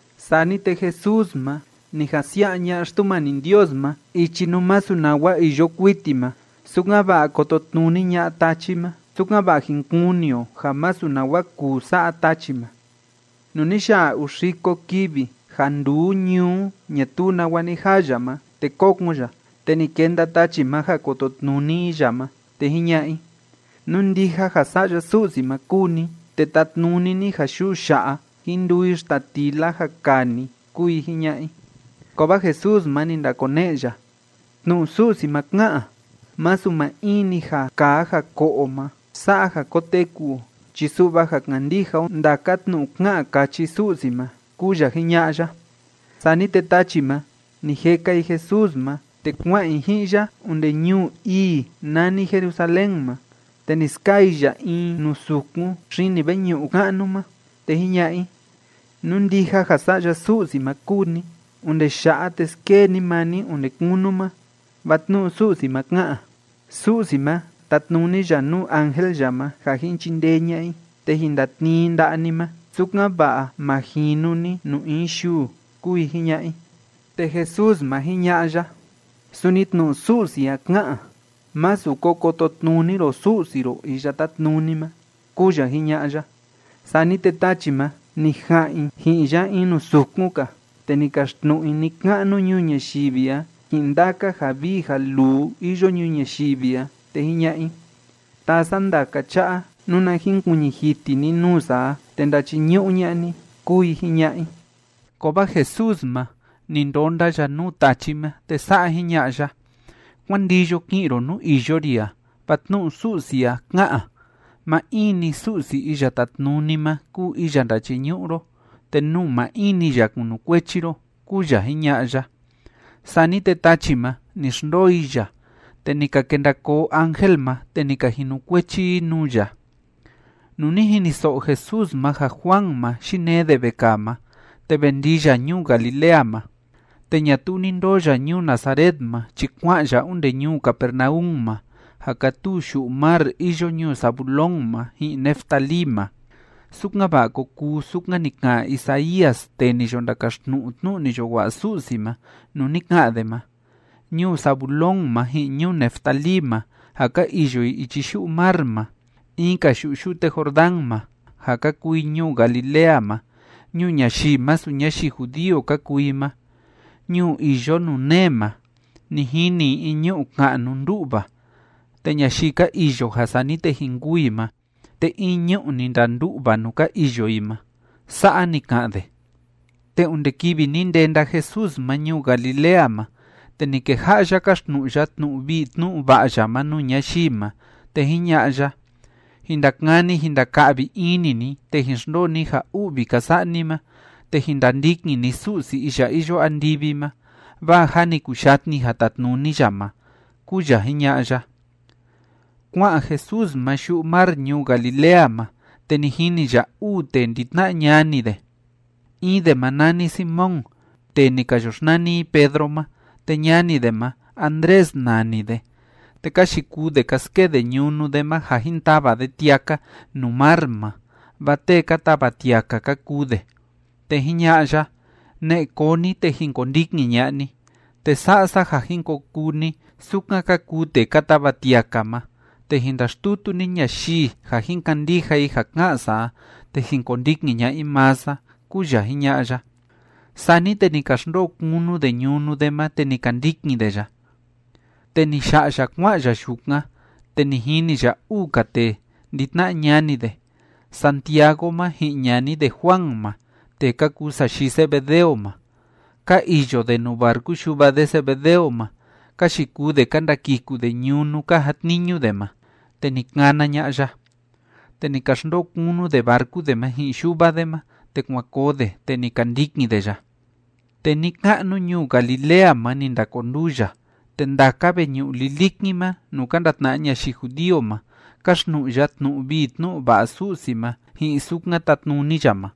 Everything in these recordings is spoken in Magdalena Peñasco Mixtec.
Sani te Jesús ma, ni jan xsia'a ña'a Xtumani Ndios ma ichi nuu masu nawa iyo kuiti ma, sukan‑va'a kototnuni ña'a tachi ma, sukan‑va'a jin kuni o ja masu nawa kuu sa'a tachi ma. Nuu ni ya'a uu xiko kivi ja nduu ñuu ñatuu nawa ni jaa ya ma, te kókon ya. Te ni kenda tachi ma ja kototnuni i ya ma, te jiña'a i: ―Nú ndija ja Sa'ya Su'si ma kúu ni, te tatnuni ni ja yuu ya'a, jín nduu i xtatila ja kaa ni ―kúu i jiña'a i. Kovaa Jesús ma, ni ndakone'e ya: ―Tnu'u Su'si ma ká'an: “Masu maa in‑ni ja kaa ja ko'o o ma sa'a ja koteku o chi su'va ja kandija o ndaka tnu'u ká'an káchi Su'si ma” ―kúu ya jiña'a ya. Sani te tachi ma, ni jeka i Jesús ma, te kua'an i ji'in ya onde ñuu ii nani Jerusalén ma, te ni skaa i ya in nuu sukun xini veñu'u ka'nu ma, te jiña'a i: ―Nú ndija ja Sa'ya Su'si ma kúu ni, onde ya'a, te skee ni maa ni onde kunu ma, vaa tnu'u Su'si ma ká'an: Su'si ma, tatnuni ya nuu ángel ya ma ja jin chindee ña'a i, te jin ndatnii i nda'a ni ma, sukan‑va'a ma jinu ni nuu in yuu ―kúu i jiña'a i. Te Jesús ma, jiña'a ya: ―Suni tnu'u Su'si a ká'an: “Másu ko kototnuni ro Su'si ro Iya Tátnuni ma” ―kúu ya jiña'a ya. Sani te tachi ma, ni ja'an i ji'in ya in nuu sukun‑ka, te ni kaxtnu'u i ni‑ka'nu ñuu ñayivi a ji'in ndaka ja vii ja luu iyo ñuu ñayivi a, te jiña'a i: ―Taa sa ndaka cha'a, nuna jinkuiñi jiti ni nuu sa a te ndachiñu'u ña'a ni ―kúu i jiña'a i. Kovaa Jesús ma, ni ndonda ya nuu tachi ma, te sa'a jiña'a ya: ―Kuán ndiyo ki'in ro nuu iyo ri a, vaa tnu'u Su'si a ká'an: “Maa in‑ni Su'si Iya Tátnuni ma kúu iya ndachiñu'u ro, te nuu maa in‑ni ya kunukuechi ro” ―kúu ya jiña'a ya. Sani te tachi ma, ni xndoo i ya, te ni ka kenda koo ángel ma, te ni ka jinukuechi i nuu ya. Nuu ni jiniso'o Jesús ma ja Juan ma, yinee de vekaa ma, te ve ndii ya ñuu Galilea ma. Te ñatuu ni ndoo ya ñuu Nazaret ma chi kua'an ya onde ñuu Capernaum ma ja kátuu yu'u mar iyo ñuu Zabulón ma ji'in Neftalí ma, sukan‑va'a ko kuu sukan ni ka'an Isaías tee ni yo ndakaxtnu'u tnu'u ni yo wa'a Su'si ma, nuu ni ka'an de ma: Ñuu Zabulón ma ji'in ñuu Neftalí ma, ja ka iyo i ichi yu'u mar ma, in‑ka yu'u yute Jordán ma, ja ka kuu i ñuu Galilea ma, ñuu ñayii masu ñayii judío ka kuu i ma. Ñuu iyo nuu nee ma, ni jini i in ñu'u ka'nu ndú'va, te ñayii ka iyo ja sani te jin kûu i ma, te in ñu'u ni ndandu'va nuu ka iyo i ma. Sa'a ni ka'an de. Te onde kivi ni ndenda Jesús ma ñuu Galilea ma, te ni keja'a ya káxtnu'u ya tnu'u vii tnu'u va'a ya ma nuu ñayii ma, te jiña'a ya: ―Jin ndakani jin ndaka'vi ini ni, te jin xndoo ni ja u'vi ka sa'a ni ma, te jin ndandikin ni Su'si iya iyo andivi ma, vaa jâ ni kuyatni ja tatnuni ya ma ―kúu ya jiña'a ya. Kua'an Jesús ma yu'u mar ñuu Galilea ma, te ni jini ya uu tee ndi‑tna'a ñani de. In de ma nani Simón, tee ni ka yo xnani i Pedro ma, te ñani de ma, Andrés nani de. Te ka yikuu de ka skee de ñunu de ma ja jin tava de tiaka nuu mar ma, vaa tee ka tava tiaka ka kuu de. Te jiña'a ya: ―Ne'e koo ni, te jin kondikin ña'a ni, te sa'a sa ja jin ko kuu ni sukan ka kuu tee ka tava tiaka ma, te jin ndaxtutu ni ñayii ja jin kandija i ja ká'an sa a, te jin kondikin ña'a i maa sa ―kúu ya jiña'a ya. Sani te ni ka xndoo kunu de ñunu de ma, te ni ka ndikin de ya. Te ni ya'a ya kua'an ya yukan, te ni jini ya uu‑ka tee ndi‑tna'a ñani de, Santiago ma ji'in ñani de Juan ma, tee ka kuu sayii Zebedeo ma. Ka iyo de nuu barcu yuva de Zebedeo ma, ka yikuu de ka ndakiku de ñunu ka jatniñu de ma. Te ni kana ña'a ya. Te ni ka xndoo kunu de barcu de ma ji'in yuva de ma, te kuan koo de, te ni ka ndikin de ya. Te ni‑ka'nu ñuu Galilea ma ni ndakonduu ya, te ndaka veñu'u lilikin ma nuu ka ndatna'a ñayii judío ma, káxtnu'u ya tnu'u vii tnu'u va'a Su'si ma ji'in sukan tatnuni ya ma.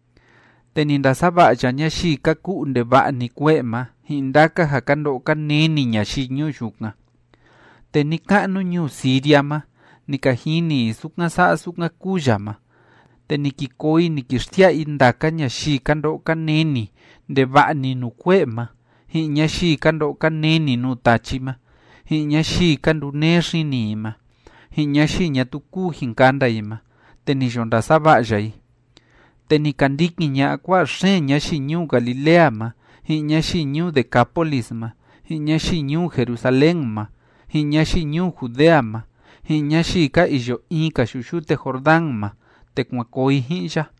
Te ni ndasava'a ya ñayii ka ku'u ndeva'a‑ni kue'e ma ji'in ndaka ja ka ndo'o ka neni ñayii ñuu yukan. Te ni‑ka'nu ñuu Siria ma ni ka jini i sukan sa'a sukan kúu ya ma, te ni ki koo i ni ki xsia'a i ndaka ñayii ka ndo'o ka neni ndeva'a‑ni nuu kue'e ma, ji'in ñayii ka ndo'o ka neni nuu tachi ma, ji'in ñayii ka nduneé xini i ma, ji'in ñayii ñatuu kúu jin kanda i ma, te ni yo ndasava'a ya i. Te ni ka ndikin ña'a kua'a xeen ñayii ñuu Galilea ma, ji'in ñayii ñuu Decápolis ma, ji'in ñayii ñuu Jerusalén ma, ji'in ñayii ñuu Judea ma, ji'in ñayii ka iyo in‑ka yu'u yute Jordán ma, te kuan koo i ji'in ya.